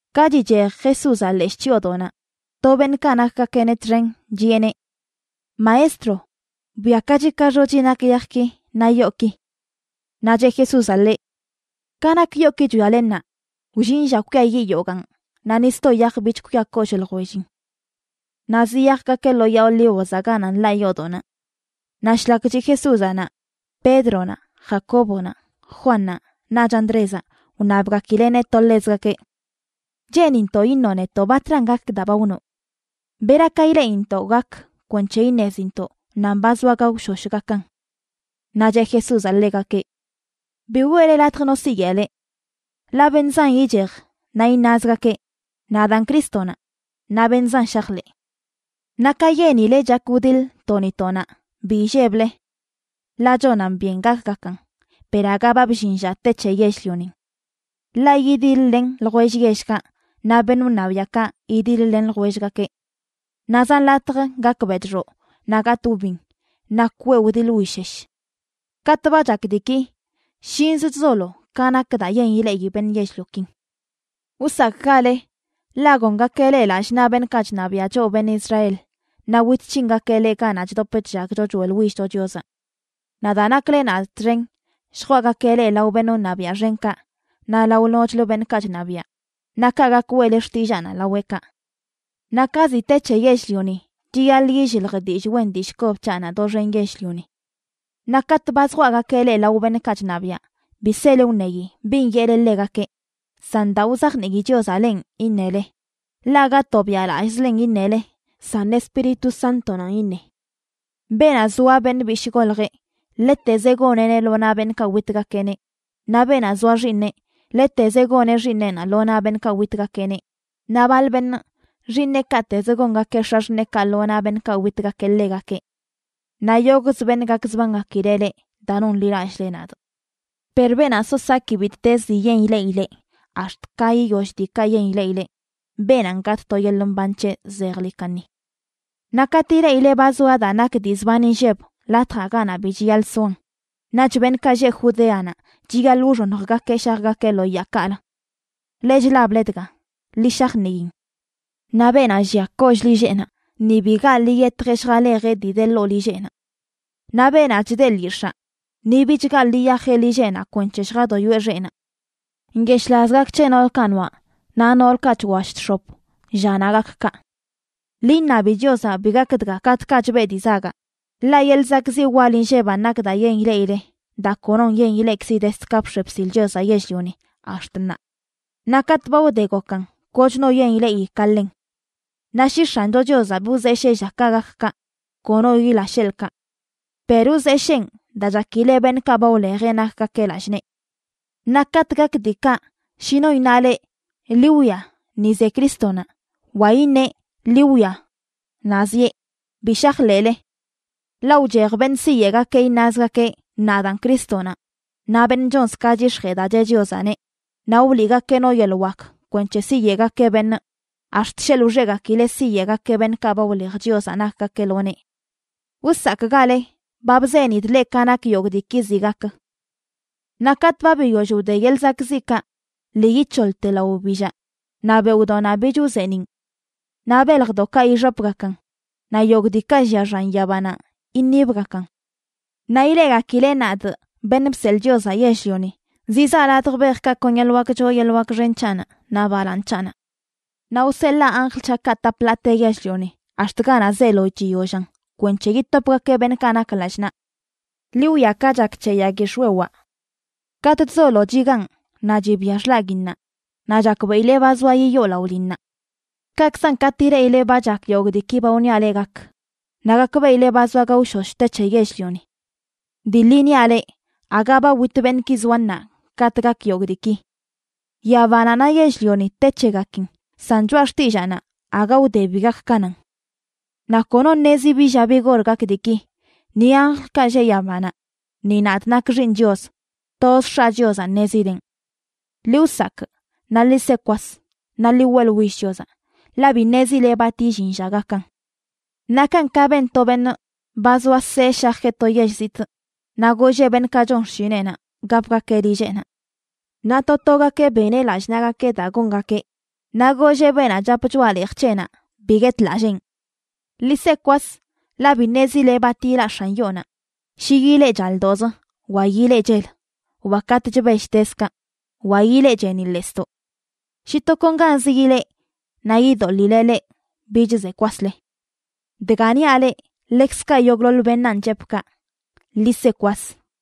Ka chichej Jesúzaꞌ leshꞌ chyoodoꞌnaꞌ, to beṉꞌkaꞌ nakgakeꞌneꞌ txen chiꞌeneꞌ: ―Maestro, bwiakachi ka xochi nak yajki naꞌ yooki. Naꞌ cheꞌ Jesúzaꞌ ḻeꞌ: ―Ka nak yooki chwiale ṉaa, wllin lla kwiayiꞌ yogaan naꞌ ni sto yaj bich kwia kollꞌ ljwellin. Naꞌ ziyajgakeꞌ lo Yaa Olívozaꞌ ganaꞌ nḻaꞌ yoodoꞌnaꞌ. Naꞌ shlak chiꞌ Jesúzaꞌ naꞌ, Pédronaꞌ, Jacóbonaꞌ, Juannaꞌ, naꞌch Andrézaꞌ wṉabgakileꞌneꞌ to ḻezgakeꞌ: ―Cheenintoꞌ iṉoꞌ netoꞌ batran gak daa ba wnoꞌ. ¿Bera ka ileꞌintoꞌ gak kwenc̱he iṉezintoꞌ nan ba zoa gaoshosh gakan? Naꞌ cheꞌ Jesúzaꞌ ḻegakeꞌ: ―Bi weꞌle latj no siyeꞌ leꞌ. Ḻaꞌ beṉꞌ zan ichej naꞌ iṉazgakeꞌ: “Nadaan Crístonaꞌ”, naꞌ beṉꞌ zan shajḻeꞌ. ’Naꞌ ka yenile chak wdiḻ to ni to naꞌ, bi illeble. Ḻaꞌ chonan byen gakgakan, per aga ba bllin lla te c̱he yell-lionin. Ḻaꞌ yidiḻ-len ljwell yellkaꞌ naꞌ beṉꞌ wṉabiaꞌkaꞌ yidiḻ-len ljwellgakeꞌ. Naꞌ zan latj gak bedxoꞌ, naꞌ gatꞌ wbin, naꞌ kweꞌ wdiḻ wishesh. Katꞌ ba chak diiki shinz chzolo ka nak daa yen ileꞌi beṉꞌ yell-liokin. ’Wsakꞌgale, ḻaꞌ gongakeꞌ leꞌ lallꞌ naꞌ beṉꞌkaꞌ chṉabiaꞌ choꞌ beṉꞌ Israel, naꞌ wit c̱hingakeꞌ leꞌ ganaꞌ chdop chllagcho choeꞌḻwillcho Chiozaꞌ. Naꞌ daa nakle nadꞌ txen, lljwaꞌgakeꞌ leꞌ lao beṉꞌ wṉabiaꞌ xenkaꞌ naꞌ lao nochlə beṉꞌkaꞌ chṉabiaꞌ, naꞌ kaꞌ gak weꞌle xtillaanaꞌ laweꞌkaꞌ. Naꞌ ka ziꞌ te c̱he yell-lioni, chiyaḻꞌ illilj dillꞌ wen dillꞌ kob c̱haꞌnaꞌ doxen yell-lioni. Naꞌ katꞌ ba zjwaꞌgakeꞌ leꞌ lao beṉꞌkaꞌ chṉabiaꞌ, bi sele wṉeyi bin yeꞌle ḻegakeꞌ, san daa wzajnii Chiozaꞌ lenꞌ iṉele, ḻaꞌ aga tobiaꞌlallꞌzlen iṉele, san Espíritu Sántonanꞌ iṉe. Beenaꞌ zoa beṉꞌ bishꞌ goljeꞌ, ḻetezeꞌ goneꞌneꞌ lo naꞌ beṉꞌkaꞌ witgakeꞌneꞌ, naꞌ beenaꞌ zoa xiiṉeꞌ, ḻetezeꞌ goneꞌ xiiṉeꞌna lo naꞌ beṉꞌkaꞌ witgakeꞌneꞌ, naꞌ baḻ beṉꞌ, xiiṉeꞌkaꞌtezə gongakeꞌ x̱axṉeekaꞌ lo naꞌ beṉꞌkaꞌ witgakeꞌ ḻegakeꞌ. Naꞌ yogꞌzə beṉꞌ gakzbangakileꞌ leꞌ daa nonḻilallꞌle nadꞌ. Per beenaꞌ so saki bittez dii yen ileꞌileꞌ ax̱t ka yiyoll diikaꞌ yen ileꞌileꞌ, beenanꞌ gatꞌ to yeḻꞌ mban c̱heꞌ zejḻi kaṉi. ’Naꞌ katꞌ ileꞌile ba zoa daa nak dii zban inlleb latjaꞌ ganaꞌ bi chiyaḻꞌ soan, naꞌch beṉꞌkaꞌ lleꞌ Judeanaꞌ chiyaḻꞌ wxoṉjgakeꞌ shajgakeꞌ lo yaakaꞌlə. (Leꞌ chlable dga, ḻi shajniin.) Naꞌ beenaꞌ llia kollꞌ lilleꞌnaꞌ ni bi gaḻꞌ yiyetjeꞌ lljalejeꞌ dii de ḻoo lilleꞌnaꞌ. Naꞌ beenaꞌ chda lyix̱aa, ni bich gaḻꞌ yiyajeꞌ lilleꞌnaꞌ kwenc̱he lljadoyoeꞌ xeꞌnaꞌ. ¡Nyeshꞌlaz gak c̱he noolkaꞌ noaꞌ naꞌ noolkaꞌ chwallꞌ chx̱op llanaꞌ gak kaꞌ! Ḻi iṉabi Chiozaꞌ bi gak dga katꞌkaꞌ chbeꞌ dii zagaꞌ, ḻaꞌ yeḻꞌ zakꞌziꞌ wal inlleban nak daa yen ileꞌile, daa konoṉꞌ yen ileꞌkzi dezd ka bx̱e bsil Chiozaꞌ yell-lioni ax̱t ṉaa, naꞌ katꞌ ba wde gokan kochno yen ileꞌi ka ḻen. Naꞌ shi X̱ancho Chiozaꞌ bi wzeshee llakaꞌ gak kaꞌ, kono yila sheḻꞌkaꞌ. Per wzesheen daa chakileꞌ beṉꞌkaꞌ ba wlejeꞌ nakgakeꞌ lallꞌ nee. ’Naꞌ katꞌ gak diikaꞌ, shi no iṉa leꞌ: “Ḻi wwia, ni ze Crístonaꞌ”, wa iṉeꞌ, “Ḻi wwia, naꞌ zieꞌ”, bi shajḻeꞌle. Ḻaꞌ wchej beṉꞌ siyeꞌgakeꞌ iṉazgakeꞌ: “Nadaan Crístonaꞌ”, naꞌ beṉꞌ chonz ka chyix̱jee daa cheꞌ Chiozaꞌneꞌ, naꞌ wliꞌgakeꞌ no yeḻꞌ wak kwenc̱he siyeꞌgakeꞌ beṉꞌ, ax̱t sheḻꞌ wxegakileꞌ siyeꞌgakeꞌ beṉꞌkaꞌ ba wlej Chiozaꞌ nakgakeꞌ lo nee. Wsakꞌgale. Ba bzenidꞌ leꞌ ka nak yogꞌ diiki ziꞌ gak. ’Naꞌ katꞌ ba biyoll wde yeḻꞌ zakꞌziꞌkaꞌ, lii yic̱hoḻte lao wbillaꞌ naꞌ beoꞌdoꞌnaꞌ bich wzeeniꞌn. Naꞌ beljdoꞌkaꞌ ixopgakan naꞌ yogꞌ diikaꞌ llia xan yabanaꞌ iṉibgakan. Naꞌ ileꞌgakileꞌ nadꞌ, Beṉꞌ Bseḻꞌ Chiozaꞌ Yell-lioni, zizaa ladj bejkaꞌ kon yeḻꞌ wak choo yeḻꞌ wak xen c̱haꞌnaꞌ naꞌ balaaṉ c̱haꞌnaꞌ. Naꞌ wseḻaa anjl c̱haꞌkaꞌ tap ḻaate yell-lioni ax̱t ganaꞌ zeelo chiyollan kwenc̱he yitopgakeꞌ beṉꞌkaꞌ nak lallꞌ naꞌ. ’Ḻi wwia ka chak c̱he yag yix̱wewaꞌ: katꞌ chzolo chigaan naꞌ chibia xḻaguinnaꞌ, naꞌ chakbeꞌile ba zoa yiyoo laꞌo linnaꞌ. Kaꞌkzan, katꞌ ileꞌile ba chak yogꞌ diiki ba wniaꞌ leꞌ gak, naꞌ gakbeꞌile ba zoa gaoshosh te c̱he yell-lioni. Dii ḻi niaꞌ leꞌ, aga ba wit beṉꞌki zoa ṉaa katꞌ gak yogꞌ diiki. Yabanaꞌ naꞌ yell-lioni te c̱hegakin, san choꞌa xtillaanaꞌ aga wde bi gak ka nan. ’Naꞌ kono ṉezi bi lla bi gor gak diiki, ni anjlkaꞌ lleꞌ yabanaꞌ, ni nadꞌ nakꞌ Xiiṉꞌ Chios. Toz X̱aꞌ Chiozaꞌ ṉezileꞌn. ’Ḻi wsakꞌ, naꞌ ḻi se kwas, naꞌ ḻi weꞌḻwill Chiozaꞌ, ḻaꞌ bi ṉezile bat illin lla gakan. Nakan ka ben to beṉꞌ ba zoa see shajeꞌ to yell zitꞌ, naꞌ golleꞌ beṉꞌkaꞌ chon xshineꞌnaꞌ gapgakeꞌ lilleꞌnaꞌ. Naꞌ to togakeꞌ beneꞌ lallꞌ naꞌgakeꞌ daa gongakeꞌ, naꞌ golleꞌ beenaꞌ chap choꞌa leej c̱heꞌnaꞌ bi guetlalleen. Ḻi se kwas, ḻaꞌ bi ṉezile bat yilaꞌ x̱an yoonaꞌ; shi yilee chaldoꞌzə, wa yilee chel, wa katꞌ chbell tezkaꞌ, wa yilee cheeniꞌḻesdoꞌ. Shi tokonganzə yilee naꞌ yidoḻileꞌ leꞌ bich ze kwasle. Dga niaꞌ leꞌ, ḻekzkaꞌ yogꞌḻoḻ beṉaan chepꞌ kaꞌ, ḻi se kwas.